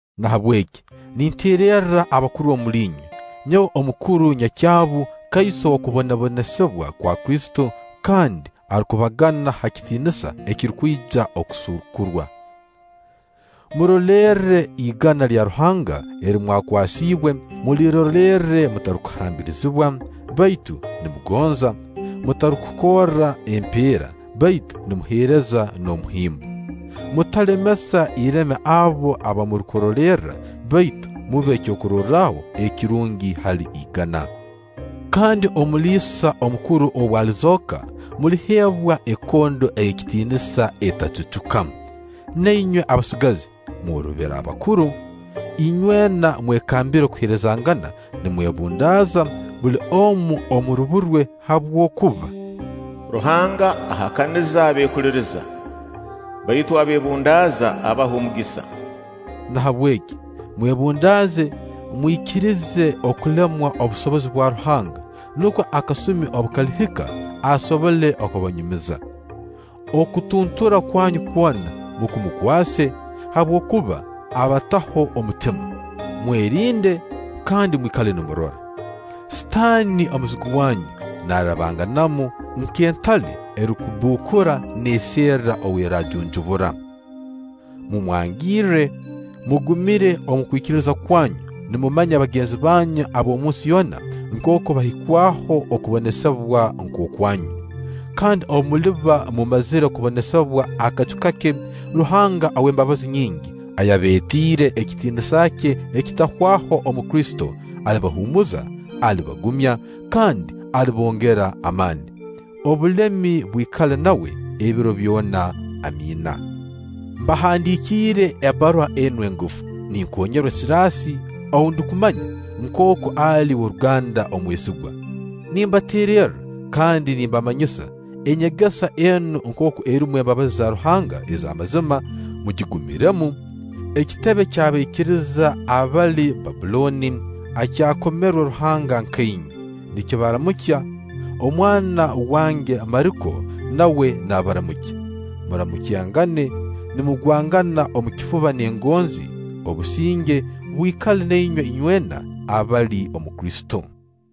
Nahabweki ninteererra abakuru omuli inywe, nyowe omukuru nyakyabu, kaiso w'okubonesibwa kwa Kristo kandi arukubagana ha kitiinisa ekirukwija kusuukurwa: Murolerre igana lya Ruhanga eri mwakwasiibwe, mulirolerre mutarukuhambirizibwa, baitu nimugonza; mutarukukorra empeera, baitu nimuheereza n'omuhimbo. Mutalemesa ireme abo aba murukurolerra, baitu mube kyokurorraho ekirungi hali igana. Kandi Omuliisa omukuru obu alizooka, muliheebwa ekondo ey'ekitiinisa etacucuka. Na inywe abasigazi mworobere abakuru. Inywena mwekambire kuheerezangana nimwebundaaza, buli omu omu rubu rwe; habwokuba: “Ruhanga ahakaniza abeekuliiriza; baitu abeebundaaza, abaha omugisa.” Nahabweki mwebundaaze mwikirize kulemwa obusobozi bwa Ruhanga, nukwo akasumi obu kalihika asobole kubanyumiza. Okutuntura kwanyu kwona mukumukwase, habwokuba abataho omutima. Mwerinde kandi mwikale nimurora. sitaani, omuzigu wanyu, naarabanganamu nk'entale erukubbukura, neeserra ou eraajunjubura. Mumwangirre, mugumiire omu kwikiriza kwanyu, nimumanya bagenzi banyu ab'omunsi yoona nkooku bahikwaho okubonesibwa nk'okwanyu. Kandi obu muliba mumazire kubonesibwa akacu kake, Ruhanga ow'embabazi nyingi, ayabeetiire ekitiinisa kye ekitahwaho omu Kristo, alibahuumuza, alibagumya, kandi alibongera amaani. Obulemi bwikale nawe ebiro byona. Amiina. Mbahandiikiire ebbaruha enu engufu, ninkoonyerwa Siraasi ou ndukumanya nkooku ali w'oruganda omwesigwa. Nimbateererra kandi nimbamanyisa enyegesa enu nkooku erumu embabazi za Ruhanga ez'amazima; mugigumiremu. Ekitebe ky'abaikiriza abali Bbabbulooni, akyakomerwe Ruhanga nka inywe, nikibaramukya. Omwana wange Mariko nawe naabaramukya. Muramukyangane nimugwangana omu kifuba n'engonzi. Obusinge bwikale na inywe inywena abali omu Kristo!